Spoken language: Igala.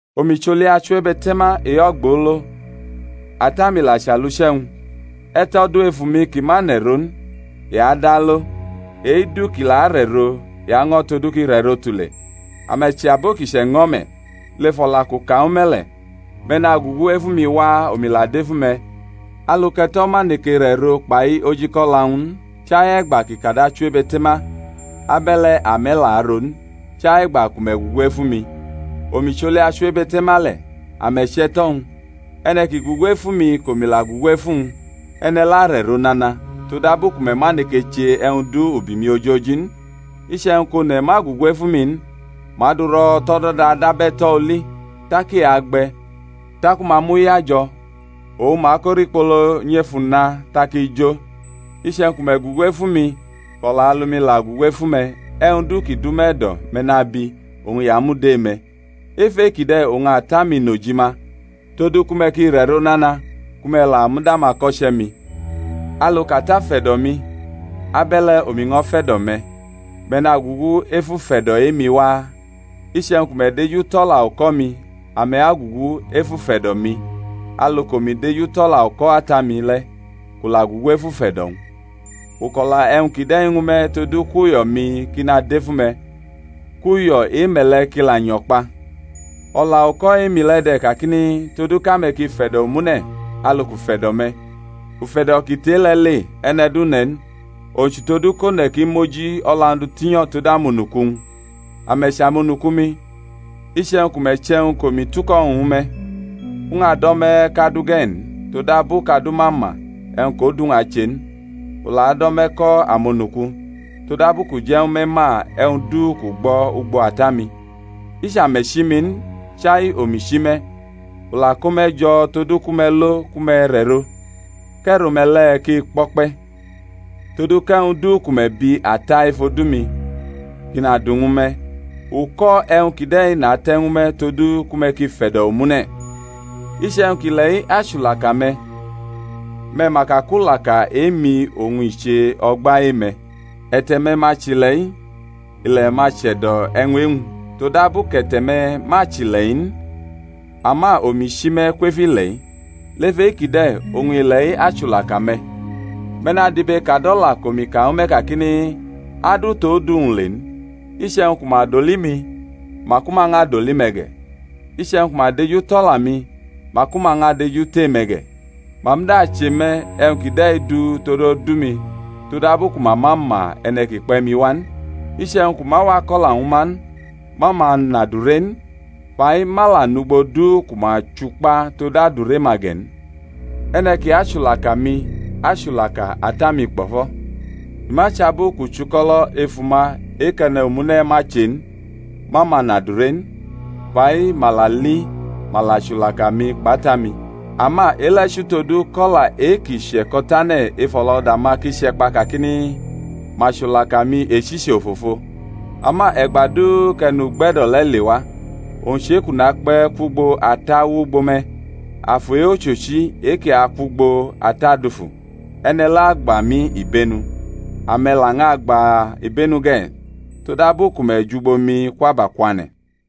Omi chʼoli achiwebe̩te̩ma e-ogbolo, Ata-mi la chʼaluche̩-wñ. E̩to̩ du ef umi ki ma nʼe̩ro n, i adʼalo, e-du ki la arʼe̩ro i año̩ todu kʼi rʼe̩ro tule. Ame̩ chʼabo ki chʼe̩ño̩ me̩, lef o̩la kʼu ka ñwu me̩ le̩. Me̩ nagugu efu mi waa, omi la dʼefu me̩. Alu kʼe̩to̩ ma neke rʼe̩ro kpai ojikʼo̩la-wñ n, chai e̩gba kʼi kad achiwebe̩te̩ma, abe̩le̩ ame̩ la aro n, chai e̩gba ku me̩ gugu efu mi. Omi chʼoli achiwebe̩te̩ma le̩, ame̩ chʼe̩to̩-wñ; e̩ne̩ ki gugu efu mi kʼomi la gugu efu wñ, e̩ne̩ le̩ arʼe̩ro nana; todabu ku me̩ ma neke che e̩wñ du ubi mi ojoji n. Iche̩wñ kʼone̩ ma gugu efu mi n, ma dʼu ro̩ tʼo̩do̩da dab e̩to̩ oli, tak i agbe̩; taku ma mʼu yajo̩, oñ ma ko rikpolo nyʼef una, tak i jo. Iche̩wñ ku me̩ gugu efu mi, kʼo̩la alu-mi la gugu efu me̩, e̩wñ du ki dʼume̩ e̩do̩ me̩ nabi, oñ i amud e-me̩. Ef e-kide̩ oñ Ata-mi nʼojima, todu ku me̩ ki rʼe̩ro nana, ku me̩ la mud amako̩che̩-mi. Alu kʼAta fe̩do̩ mi, abe̩le̩ omi ño̩ fe̩do̩ me̩; me̩ nagugu ef ufe̩do̩ e-mi waa. Iche̩wñ ku me̩ dejutʼo̩la uko̩-mi ame̩ agugu ef ufe̩do̩-mi: alu kʼomi dejutʼo̩la uko̩ Ata-mi le̩, kʼu la gugu ef ufe̩do̩-wñ. U kʼo̩la e̩wñ kide̩ ñwu me̩ todu kʼuyo̩-mi ki nadʼef ume̩, kʼuyo̩ e-me̩ le̩ ki la nyo̩ kpa. O̩la-uko̩ e-mi le̩ de̩ kakini, Todu kʼame̩ ki fe̩do̩ omune̩ alu kʼu fe̩do̩ me̩. Ufe̩do̩ ki tʼe-le̩ le e̩ne̩ du ne̩ n, owñ chʼutodu kʼone̩ ki mʼoji o̩la-wñ du tinyo̩ tod amonuku-wñ. Ame̩ chʼamonuku-mi, iche̩wñ ku me̩ chʼe̩wñ kʼomi tuko̩ ñwu me̩. U ñʼado̩ me̩ kʼadu ge̩ n; todabu kʼadu ma ma e̩wñ kʼodu-wñ ache n; u la do̩ me̩ ko̩ amonuku, todabu kʼu je̩ ñwu me̩ ma e̩wñ du kʼu gbo̩ ugbo Ata-mi. I chʼame̩ chi mi n, chai omi chi me̩, u la ko me̩ jo̩ todu ku me̩ lo ku me̩ rʼe̩ro, kʼe̩ro-me̩ le̩ ki kpo̩kpe̩; todu kʼe̩wñ du ku me̩ bi Ata ef odu-mi, kʼi nadu ñwu me̩. Uko̩ e̩wñ kide̩ nate̩ ñwu me̩ todu ku me̩ ki fe̩do̩ omune̩. Iche̩wñ kʼile̩-i achulaka me̩, me̩ ma ka kʼulaka e-mi oñ i che o̩gba e-me̩. E̩te̩-me̩ ma chʼile̩-i, ile̩ ma che̩do̩ e̩wñ e-wñ; todabu kʼe̩te̩-me̩ ma chʼile̩-i n, ama omi chi me̩ kwef ile̩-i, lef e-kide̩ oñ ile̩-i achulaka me̩. Me̩ nadibekadʼo̩la kʼomi ka ñwu me̩ kakini, Adu tʼodu-wñ le n. Iche̩wñ ku ma doli mi, maku ma ñʼadoli me̩ ge̩; iche̩wñ ku ma dejutʼo̩la-mi, maku ma ñʼadejutʼe-me̩ ge̩. Ma muda che me̩ e̩wñ kide̩ du tod odu-mi, todabu ku ma ma ma e̩ne̩ ki kpe̩ mi wa n. Iche̩wñ kʼu ma wa ko̩la ñwu ma n, ma ma nʼadure n; fa-i ma la nʼugbo du ku ma chukpa tod adure-ma ge̩ n. E̩ne̩ ki achulaka mi achulaka Ata-mi kpo̩fo̩. I ma chʼabu kʼu chʼuko̩lo̩ efu ma e-kʼe̩ne̩ omune̩ ma che n, ma ma nʼadure n: fa-i ma la li, ma la chulaka mi kpʼAta-mi. Ama e-le̩ chʼutodu kʼo̩la e-ki che̩ko̩tane̩ ef o̩lo̩da-ma ki che̩kpa kakini, Ma chulaka mi echichi ofofo. Ama e̩gba du kʼE̩nugbe̩do̩ le̩ lewa, owñ chʼe-kʼu nakpe̩ kwʼugbo Ata wʼugbo me̩, Afu e-ochochi e-ki akwʼugbo Ata dufu, e̩ne̩ le̩ agba mi ibenu. Ame̩ la ñʼagba ibenu ge̩, todabu ku me̩ jʼugbo mi kwʼabakwane̩.